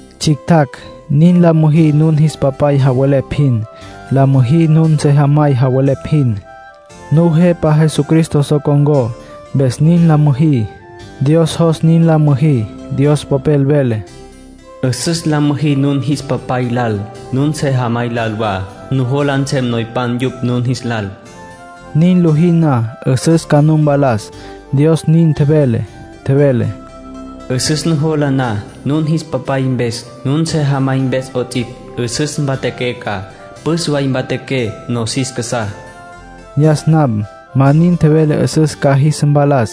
Tsjictjacj, nin la müjí nun jis papay javelepj jin. La müjí nun sejamay javelepj jin. Nujepa Jesucristo so con̈có, mpes nin la müjí. Dios jos nin la müjí. Dios Popel vele: “'Üsüs la müjí nun jis papay lal, nun sejamay lal wa. Nujola nsem noypan yupj nun jis lal.” Niná lojí na, 'üsüs ca nu mpalas, Dios nin tjevele. Tjevele: “'Üsüs nujola na nun jis papay mpes, nun sejamay mpes 'ots'ipj, 'üsüs mpatjaqué ca. Püs way mpatjaqué nosis casá.” Yas nam ma nin tjevele 'üsüs ca jis mpalas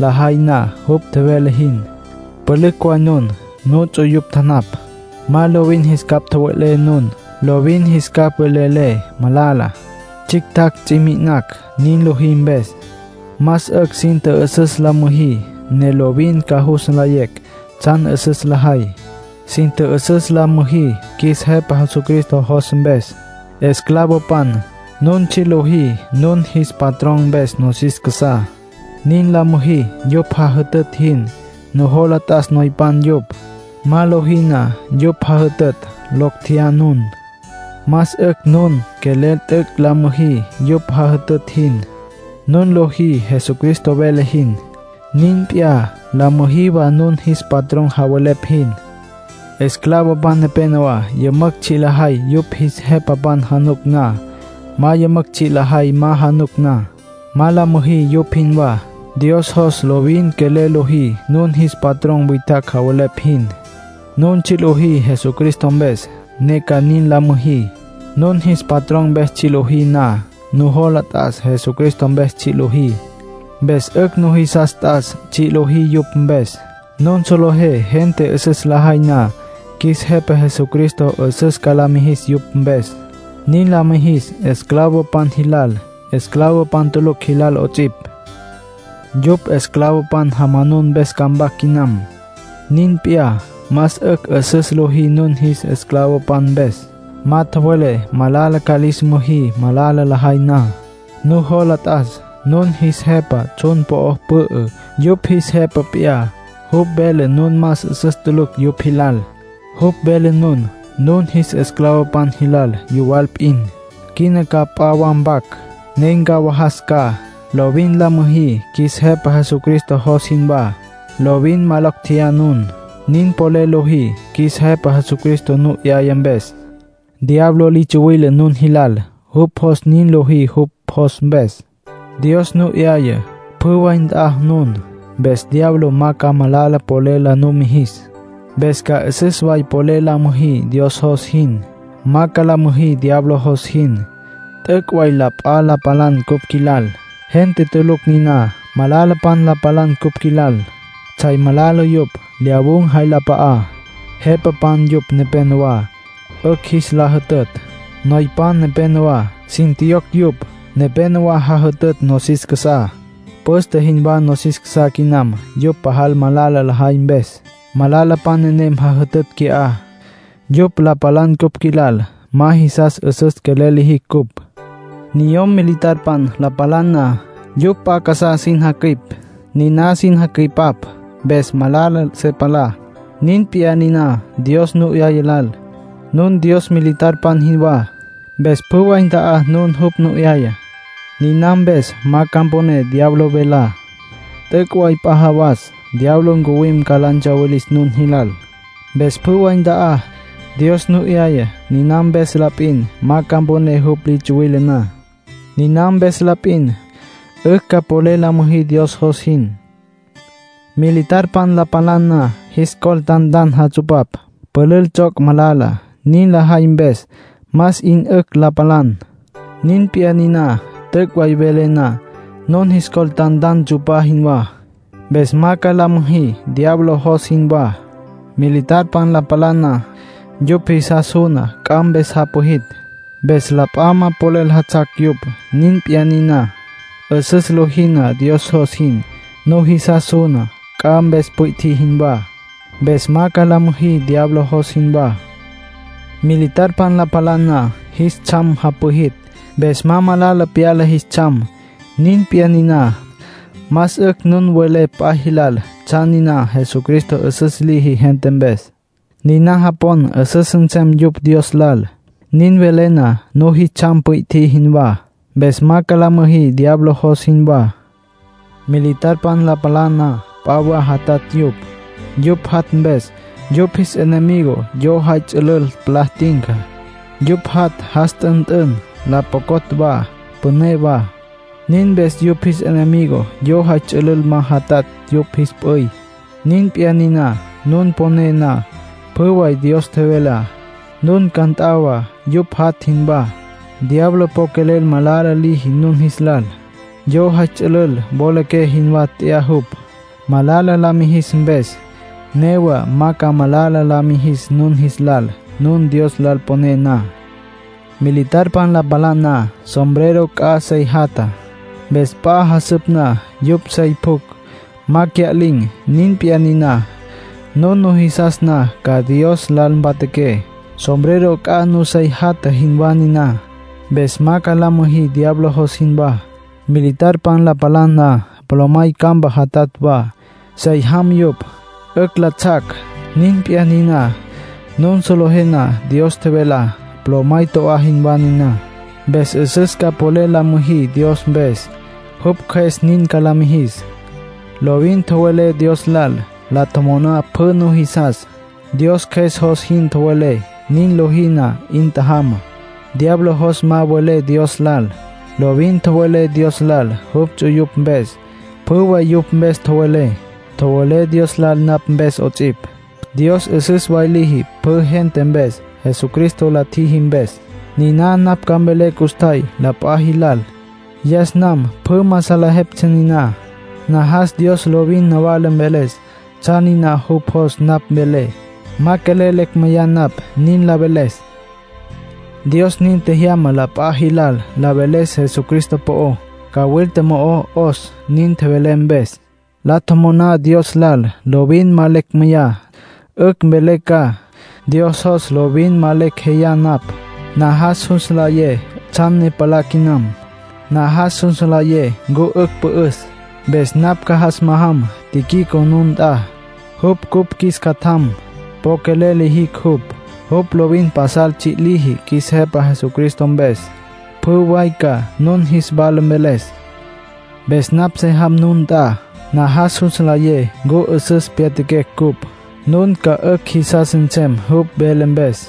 lajay na jupj tjevele jin. Pülücj way nun, nuts'uyupj tjanapj. Ma lovin jis capj tjowe'lé nun. Lovin jis capj velelé, malala. Tsjictjacj ts'i mi'inacj nin lojí mpes. Más 'ücj sin tjü'üsüs la müjí, ne lovin ca jus nlayecj tsjan 'üsüs lajay. Sin tjü'üsüs la müjí qjuis Jepa Jesucristo jos mpes. Esclavopan, nun tsji' lojí nun jis patrón mpes nosis casá. Nin la müjí yupj jajütütj jin. Nujola t'as noypan yupj. Ma lojí na yupj jajütütj, locj tjeyá nun. Más 'ücj nun quelel t'üc' la müjí yupj jajütütj jin. Nun lojí Jesucristo vele jin. Nin p'iyá, la müjí wa nun jis patrón javelepj jin. Esclavopan nepénowa yümücj tsji' lajay yupj jis jepapan januc na. Ma yümücj tsji' lajay ma januc na. Ma la müjí yupj jinwá. Dios jos nun lovin quelel lojí nun jis patrón witjacj javelepj jin. Nun tsji' lojí Jesucristo mpes, ne ca nin la müjí. Nun jis patrón mpes tsji' lojí na, nujola t'as Jesucristo mpes tsji' lojí. Mpes 'ücj nujisas t'as tsji' lojí yupj mpes. Nun solejé gente 'üsüs lajay na, qjuis Jepa Jesucristo 'üsüs ca la mijis yupj mpes. Nin la mijis esclavopan jilal, esclavopan tulucj jilal 'ots'ipj. Yupj esclavopan jamanun mpes ca mpac quinam. Nin p'iyá, más 'ücj 'üsüs lojí nun jis esclavopan mpes. Ma tjowelé malala ca lis müjí malala lajay na. Nujola t'as, nun jis Jepa tsjun po'o pü'ü, yupj jis Jepa p'iyá. Jupj vele nun más 'üsüs tulucj yupj jilal. Jupj vele nun, nun jis esclavopan jilal, yuwal p'in. Quina ca p'a wa mpac, ne ncawajas ca. Lovin la müjí qjuis Jepa Jesucristo jos jinwá. Lovin ma locj tjeyá nun. Nin polel lojí qjuis Jepa Jesucristo nu 'yaya mpes. Diablo li tsuwile nun jilal. Jupj jos nin lojí jupj jos mpes. Dios nu 'yaya, pjü way nt'a nun, mpes diablo ma ca malala polel la nu mijis. Mpes ca 'üsüs way polel la müjí Dios jos jin. Ma ca la müjí diablo jos jin. T'üc' way la p'a la palan cupj qjuilal. Gente tulucj niná. Malalapan la palan cupj qjuilal. Tsjay malala yupj. Lyawun̈ jay la p'a'á. Jepapan yupj nepenowá, 'ücj jis la jütütj. Noypan nepenowá, sin tjiyocj yupj. Nepénowa jajütütj nosis casá. Püste jinwá nosis casá quinam yupj pajal malala lajay mpes. Malalapan nenem jajütütj qui'á. Yupj la palan cupj qjuilal; ma jisas 'üsüs quelel lijicj cupj. Niyom militar la palan na, yupj p'a casá sin jacüipap. Niná sin jacüipap mpes, ma malala se palá. Nin p'iyá niná Dios nu 'yaya lal. Nun Dios militarpan jinwá, mpes pjü way nt'a nun jupj nu 'yaya. Niná mpes, ma ca mponé diablo velá. T'üc' way p'a jawas diablo ncuwim ca la ntsawilis nun jilal. Mpes pjü way nt'a nun, Dios nu 'yayá. Niná mpes la p'in, ma ca mponé jupj li tsuwile na. Niná mpes la p'in, 'ücj ca polel la müjí Dios jos jin. Militarpan la palan na, jis col tantan jatsupapj; pülül tsjoc' malala. Nin lajay mpes más 'in 'ücj la palan. Nin p'iyá niná, t'üc' way welé na, nun jis col tantan tsu'pá jinwá. Mpes ma ca la müjí diablo jos jinwá. Militarpan la palan na, yupj jisas suna c'a mpes japwijitj, mpes la p'a ma polel jatsjac yupj. Nin p'iyá niná, 'üsüs lojí na Dios jos jin, nujisas suna c'a mpes pwi'tjí jinwá. Mpes ma ca la müjí diablo jos jinwá. Militarpan la palan na, jis tsjam japwijitj, mpes ma malala pyala jis tsjam. Nin p'iyá niná, más 'ücj nun welé p'a jilal tsjan niná Jesucristo 'üsüs liji gente mpes. Niná japon, 'üsüs nsem yupj Dios lal. Nin welé na, nun jis tsjam pwi'tjí jinwá. Mpes ma ca la müjí diablo jos jinwá. Militarpan la palan na, p'a wa jatatj yupj. Yupj jat' mpes, yupj jis enemigo yo jay ts'ülül palá tinca. Yupj jat' jas t'ünt'ün, la pjocotj wa, püné wa. Nin mpes yupj jis enemigo yo jay ts'ülül ma jatsjac yupj jis p'üy. Nin p'iyá niná, nun poné na pjü way Dios tjevelá, nun ca nt'a wa yupj jat' jinwá. Diablo po quelel malala liji nun jis lal. Yo jay ts'ülül wolaqué jinwá tya'a jupj, malala la mijis mpes. Newa ma ca malala la mijis nun jis lal nun Dios lal poné na. Militarpan la palan na, sombrero c'a sey jatja. Mpes p'a jasüp na yupj sey pjucj, ma cya'lin̈. Nin p'iyá niná, nun nujisas na ca Dios lal mpatjaqué, sombrero c'a nun sey jatja jinwá niná. Mpes ma ca la müjí diablo jos jinwá. Militarpan la palan na, polomay campa jatatj wa, sey jam yupj, 'ücj la tsjac. Nin p'iyá niná, nun solejé na Dios tjevelá, polomay to'á jinwá niná. Mpes 'üsüs ca polel la müjí Dios mpes, jupj Cjües nin ca la mijis. Lovin tjowelé Dios lal. La tjomoná pjü nujisas. Dios Cjües jos jin tjowelé. Nin lojí na, 'in tjajama. Diablo jos ma welé Dios lal. Lovin tjowelé Dios lal jupj ts'uyupj mpes, pjü way yupj mpes tjowelé. Tjowelé Dios lal napj mpes 'ots'ipj. Dios 'üsüs way liji pjü gente mpes Jesucristo la tjiji mpes. Niná napj ca mvelé custjay la p'a jilal. Yas nam pjü ma salejeptsja niná. Najas Dios lovin nawala mveles tsjan niná jupj jos napj velé. Ma quelel lecj meyá napj nin la veles. Dios nin tjejyama la p'a jilal la veles Jesucristo po'ó. Cawilta mo'o 'os nin tjevelé mpes. La tjomoná Dios lal lovin ma lecj meyá, 'ücj mvelé ca. Dios jos lovin ma lecj jeyá napj. Najas jus nlayé tsjan ne palá quinam. Najas jus nlayé ncu 'ücj pü'üs. Mpes napj ca jas majam Tíquico nun nt'a. Jupj cupj qjuis catjam. Po quelel lijicj jupj. Jupj lovin pasal tsji' liji qjuis Jepa Jesucristo mpes. Pjü way ca nun jis wala mveles. Mpes napj se jam nun nt'a. Najas jus nlayé ncu 'üsüs pyatjaquecj ncupj. Nun ca 'ücj jisas nsem jupj mveles mpes.